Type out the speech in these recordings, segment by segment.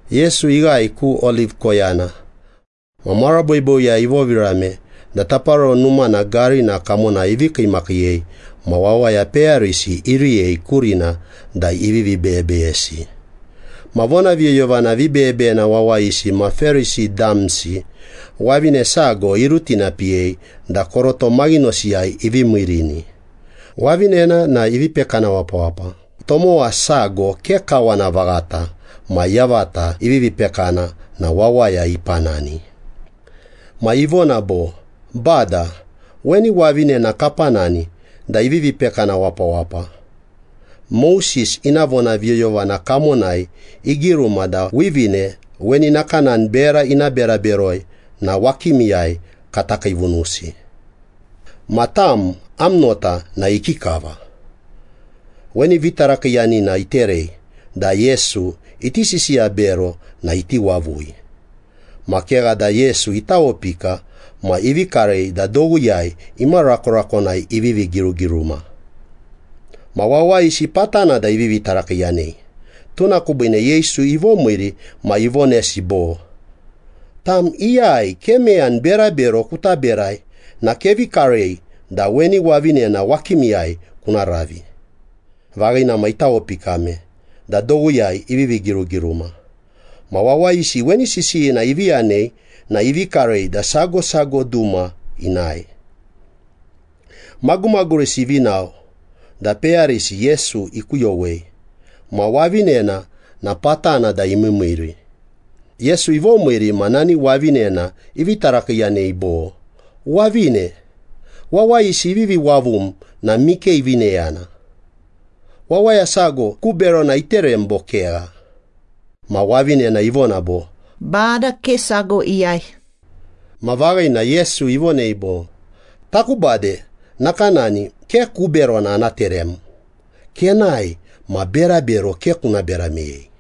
Yesu ighae ku Oliv koyana. Ma mara boiboiyai ivovirame da Taparoro Numana garina kamonai ivi kiimakiiyei ma wawaya peyarisi iriyei kurina da ivivi beyebeyesi. Ma vonaviyoyovana vibeyebeyena wawayisi ma Perisi damsi, wavine sago irutinapiyei da koroto maghinosiyai ivi miirini. Wavinena na ivi pekana wapawapa, tomowa sago ke kawana vaghata ma yavata ivivi pekana na wawaya ipanani. Ma ivona bo, “Bada, weni wavinena kapanani da ivivi pekana wapawapa. Moses ina vonaviyoyovana kamonai igiruma da wivine weni nakanani bera ina bera beroi na wakimiyai kata kiivunusi. Ma tam, am nota na ikikava?” Weni vitarakiiyanina iterei da Yesu iti sisiya bero na iti wavui. Ma kegha da Yesu itawopika ma ivi karei da dowiyai imarakorakonai ivivi girugiruma. Ma wawayisi patana da ivivi tarakiiyanei. Tuna kubiine Yesu ivomiiri ma ivonesi bo, “Tam iyai ke meyani berabero kuta berai na kevi karei da weni wavinena wakimiyai kuna ravi.” Vaghina ma itawopikame da dowiyai ivivi girugiruma. Ma wawayisi weni sisiyina ivi yanei na ivi karei da sago sago duma inae. Magumagurisi ivi nao, da peyarisi Yesu ikuyowei. Ma wavinena na patana da imiimiiri. Yesu ivomiiri ma nani wavinena ivi tarakiiyanei bo, “Wavine, wawayisi ivivi wavum na mike ivi neyana? Wawaya sago ku berona iterem, bo kegha?” Ma wavinena ivona bo, “Bada, ke sago iyai.” Ma vaghina, Yesu ivonei bo, “Taku bade nakanani, ke ku berona ana terem. Kenae, ma berabero ke kuna bera meyei.”]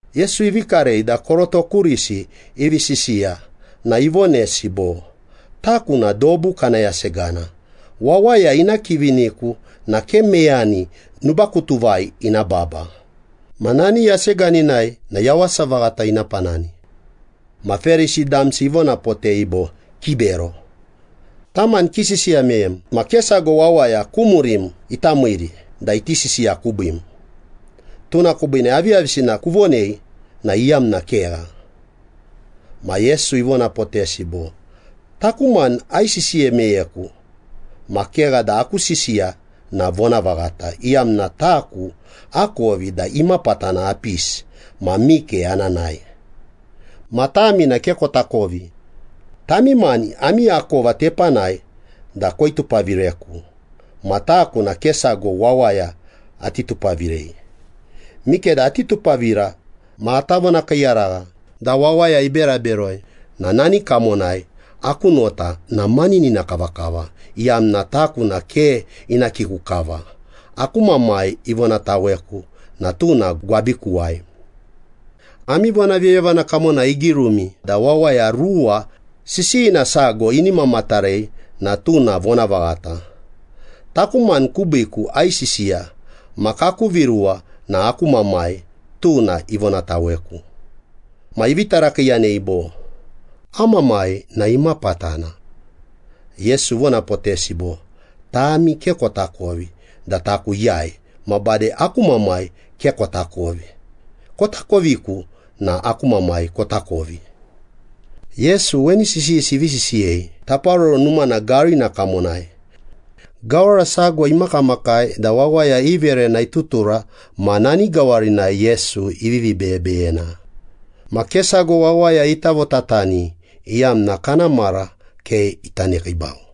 Yesu ivi karei da koroto kurisi ivi sisiya na ivonesi bo, “Taku na dobu kana yasegana. Wawaya ina kiviniku na ke meyani nubakutuvai ina baba, ma nani yaseganinai na yawasa vaghata ina panani.” Ma Perisi damsi ivonapotei bo, “Kibero. Tam mani kisisiya meyem ma ke sago wawaya ku murim ita miiri da iti sisiya kubiim, tuna kubiine aviyavisina kuvonei na iyamna kegha.” Ma Yesu ivonapotesi bo, “Taku mani aisisiya meyeku, ma kegha da aku sisiya na vonavaghata, iyamna taku akovi da imapatana apisi ma mike ana nae. Ma tami na ke kotakovi. Tami mani ami akova tepanai da koitupavireku. Ma taku na ke sago wawaya ati tupavirei. Mikeda ati tupavira ma ata vonakiiyaragha da wawaya ibera beroi na nani kamonai aku nota na maninina kavakava, iyamna taku na ke ina kiku kava. Aku Mamai ivonataweku na tuna gwabikuwai. Ami vonaviyoyovana kamonai igirumi da wawaya ruwa sisiyina sago ini mamatarei na tuna vonavaghata. Taku mani kubiiku aisisiya ma kaku viruwa na aku Mamai, tuna ivonataweku.” Ma ivi tarakiiyanei bo, “Am mamai na imapatana?” Yesu ivonapotesi bo, “Tami ke kotakovi da taku iyai ma bade aku Mamai ke kotakovi. Kotakoviku na aku Mamai kotakovi.” Yesu weni sisiyisi ivi sisiyei Taparoro Numana garina kamonai. Gawara sago imakamakai da wawaya i verena itutura ma nani gawarinai Yesu ivivi beyebeyena. Ma ke sago wawaya ita votatani, iyamna kana mara ke ita nekiibau.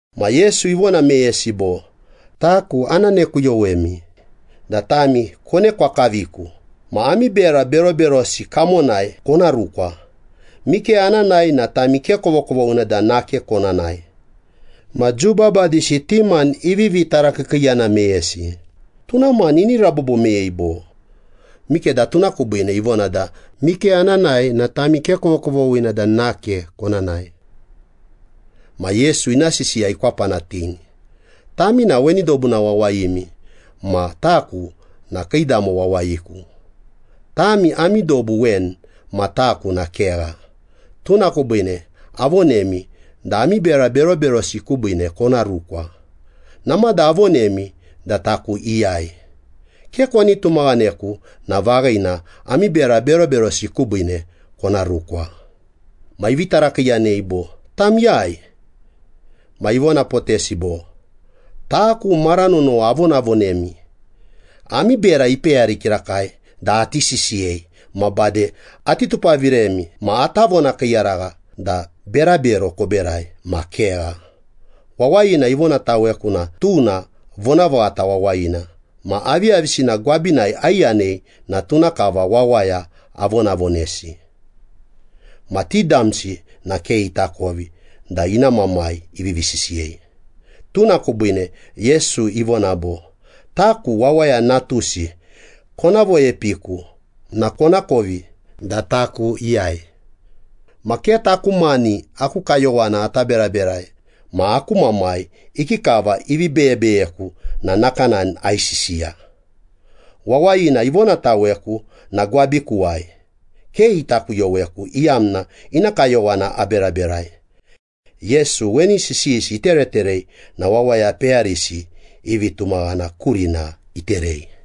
Ma Yesu ivona meyesi bo, “Taku ana nekuyowemi da tami konekwa kaviku, ma ami bera beroberosi kamonai kona rukwa. Mike ana nae na tami ke kovokovoghina da nake kona nae.” Ma Jiu babadisi ti mani ivivi tarakiikiiyana meyesi, “Tuna mani ini rabobo meyei bo? Mikeda tuna kubiine ivona da, ‘Mike ana nae na tami ke kovokovoghina da nake kona nae.’” Ma Yesu ina sisiya ikwapanatini, “Tami na weni dobuna wawayimi, ma taku na kiidamo wawayiku. Tami ami dobu weni, ma taku na kegha. Tuna kubiine avonemi da ami bera beroberosi kubiine kona rukwa. Namada avonemi da taku iyai. Ke koni tumaghaneku na vaghina, ami bera beroberosi kubiine kona rukwa.” Ma ivi tarakiiyanei bo, “Tam iyai?” Ma ivonapotesi bo, “Taku, mara nonowa avonavonemi. Ami bera ipeyari kirakai da ati sisiyei ma bade ati tupaviremi ma ata vonakiiyaragha da berabero koberai ma kegha. Wawayina ivonataweku na tuna vonavaghata wawayina. Ma aviyavisina gwabinai aiyanei na tuna kava wawaya avonavonesi.” Ma ti damsi na ke itakovi da ina Mamai ivivi sisiyei. Tuna kubiine Yesu ivona bo, “Taku Wawaya Natusi kona voepiiku na konakovi da taku iyai. Ma ke taku mani aku kayowana ata beraberai, ma aku Mamai ikikava ivi beyebeyeku na nakanani aisisiya. Wawayina ivonataweku na gwabikuwai. Ke ita kuyoweku, iyamna ina kayowana aberaberai.” Yesu weni sisiyisi itereterei na wawaya peyarisi i vitumaghana kurina iterei.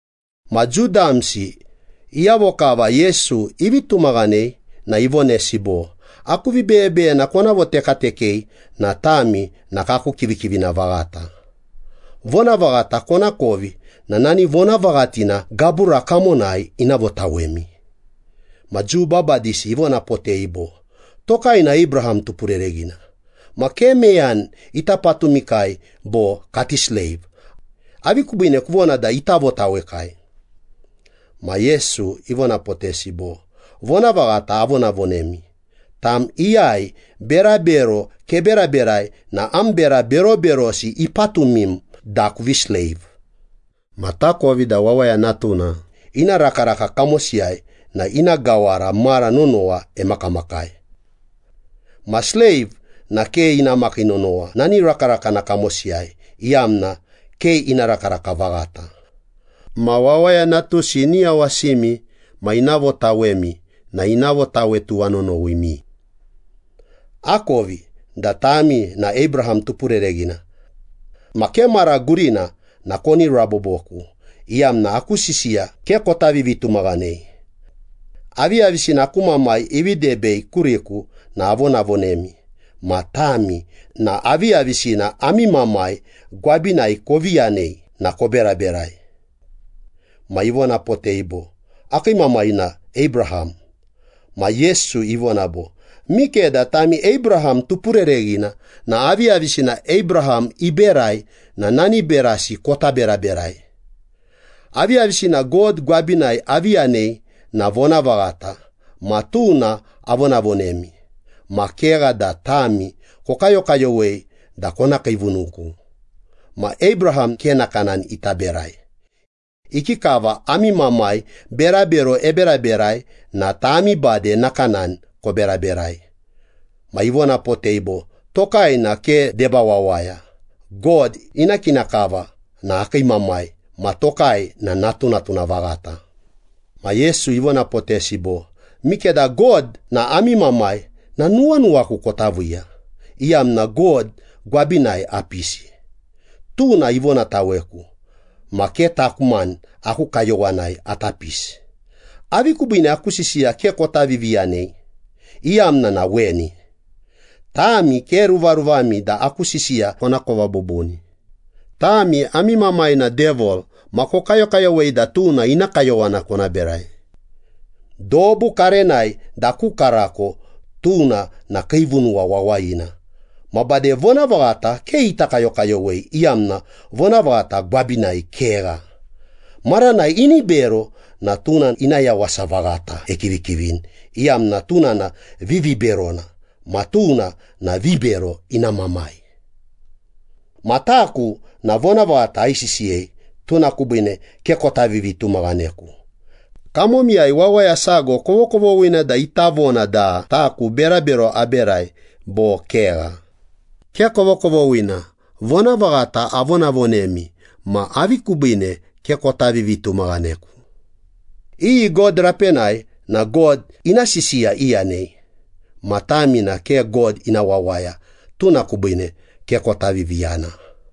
Ma Jiu damsi iyavo kava Yesu ivi tumaghanei na ivonesi bo, “Aku vibeyebeyena kona votekatekei na tami na kaku kivikivina vaghata. Vonavaghata konakovi na nani vonavaghatina gabura kamonai ina votawemi.” Ma Jiu babadisi ivonapotei bo, “Tokai na Abraham tupurereghina. Ma ke meyani ita patumikai bo kati sleiv. Avi kubiine kuvona da ita votawekai?” Ma Yesu ivonapotesi bo, “Vonavaghata avonavonemi, tam iyai berabero keberaberai na am bera beroberosi ipatumim da kuvi sleiv. Ma takovi da wawaya natuna ina rakaraka kamosiyai na ina gawara mara nonowa emakamakai. Ma sleiv na ke ina makii nonowa nani rakarakana kamosiyai, iyamna ke ina rakaraka vaghata. Ma Wawaya Natusi ini yawasimi ma ina votawemi na ina votawe tuwanonowimi. Akovi da tami na Abraham tupurereghina. Ma ke mara gurina na koni raboboku, iyamna aku sisiya ke kota vivitumaghanei. Aviyavisina aku Mamai ivi debei kuriku na avonavonemi, ma tami na aviyavisina ami mamai gwabinai kovi yanei na koberaberai.” Ma ivonapotei bo, “Akii mamai na Abraham.” Ma Yesu ivona bo, “Mikeda tami Abraham tupurereghina na aviyavisina Abraham iberai na nani berasi kota beraberai. Aviyavisina God gwabinai avi yanei na vonavaghata ma tuna avonavonemi. Ma kegha da tami kokayokayowei da kona kiivunuku. Ma Abraham ke nakanani ita berai. Ikikava ami mamai berabero eberaberai na tami bade nakanani koberaberai.” Ma ivonapotei bo, “Tokai na ke deba wawaya. God ina kina kava na akii Mamai ma tokai na natunatuna vaghata.” Ma Yesu ivonapotesi bo, “Mikeda God na ami Mamai na nuwanuwaku kota viiya, iyamna God gwabinai apisi, tuna ivonataweku. Ma ke taku mani aku kayowanai ata pisi. Avi kubiine aku sisiya ke kota viviyanei? Iyamna na weni. Tami ke ruvaruvami da aku sisiya konakova bubuni. Tami ami mamai na Devil, ma kokayokayowei da tuna ina kayowana kona berai. Dobu karenai da ku karako, tuna na kiivunuwa wawayina. Ma bade vonavaghata ke ita kayokayowei, iyamna vonavaghata gwabinai kegha. Maranai ini bero na tuna ina yawasa vaghata ekivikivini, iyamna tuna na viviberona, ma tuna na vibero ina mamai. Ma taku na vonavaghata aisisiyei tuna kubiine ke kota vivitumaghaneku. Kamomiyai wawaya sago kovokovoghina da ita vona da taku berabero aberai bo kegha? Ke kovokovoghina. Vonavaghata avonavonemi ma avi kubiine ke kota vivitumaghaneku? Iyi God rapenai na God ina sisiya iyanei. Ma tami na ke God ina wawaya, tuna kubiine ke kota viviyana.”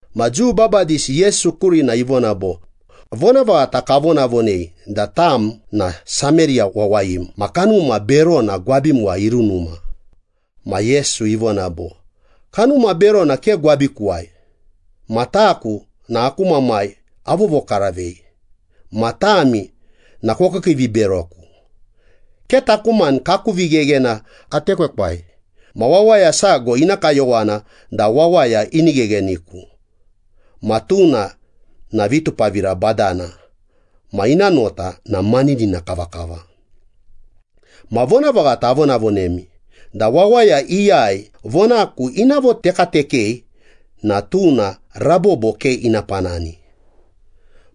Ma Jiu babadisi Yesu kurina ivona bo, “Vonavaghata kavonavonei da tam na Sameriya wawayim ma kanuma berona gwabimuwai irunuma.” Ma Yesu ivona bo, “Kanuma berona ke gwabikuwai. Ma taku na aku Mamai avovokaravei. Ma tami na kokiikiiviberoku. Ke taku mani kaku vigheghena atekwekwai ma wawaya sago ina kayowana da wawaya ini ghegheniku. Ma tuna na vitupavira badana ma ina nota na maninina kavakava. Ma vonavaghata avonavonemi da wawaya iyai vonaku ina votekatekei na tuna rabobo ke ina panani.”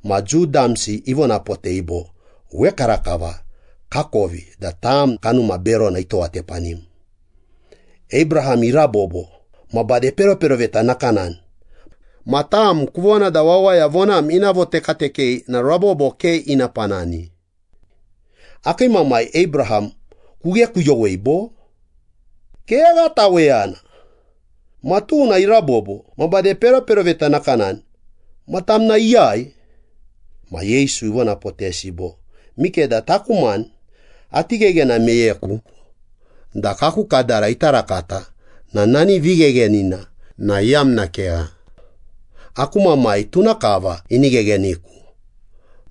Ma Jiu damsi ivonapotei bo, “Wekarakava kakovi da tam kanuma berona itowatepanim. Abraham irabobo ma bade peroperoveta nakanani. Ma tam kuvona da wawaya vonam ina votekatekei na rabobo ke ina panani. Akii mamai Abraham kughekuyowei bo? Kegha taweyana. Ma tuna irabobo ma bade peroperoveta nakanani. Ma tam na iyai?” Ma Yesu ivonapotesi bo, “Mikeda taku mani ati gheghena meyeku da kaku kadara ita rakata na nani vigheghenina na iyamna kegha. Aku Mamai, tuna kava ini ghegheniku.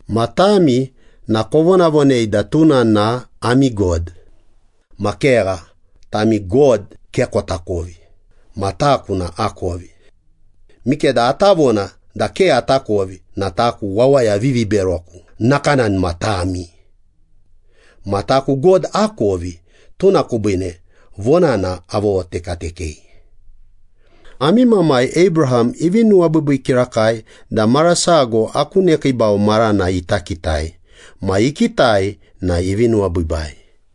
Ma tami na kovonavonei da tuna na ami God. Ma kegha, tami God ke kotakovi, ma taku na akovi. Mikeda ata vona da ke atakovi na taku wawaya viviberoku nakanani ma tami. Ma taku God akovi, tuna kubiine vonana avovotekatekei. Ami mamai Abraham ivi nuwabiibii kirakai da mara sago aku nekiibau marana ita kitai. Ma ikitai na ivi nuwabiibai.”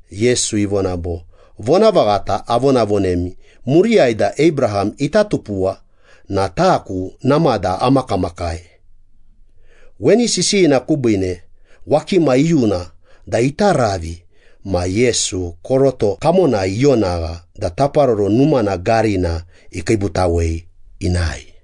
Yesu ivona bo, “Vonavaghata avonavonemi muriyai da Abraham ita tupuwa na taku namada amakamakai.” Weni sisiyina kubiine wakima iyuna da ita ravi, ma Yesu koroto kamonai ionagha da Taparoro Numana garina ikiibutawei inae.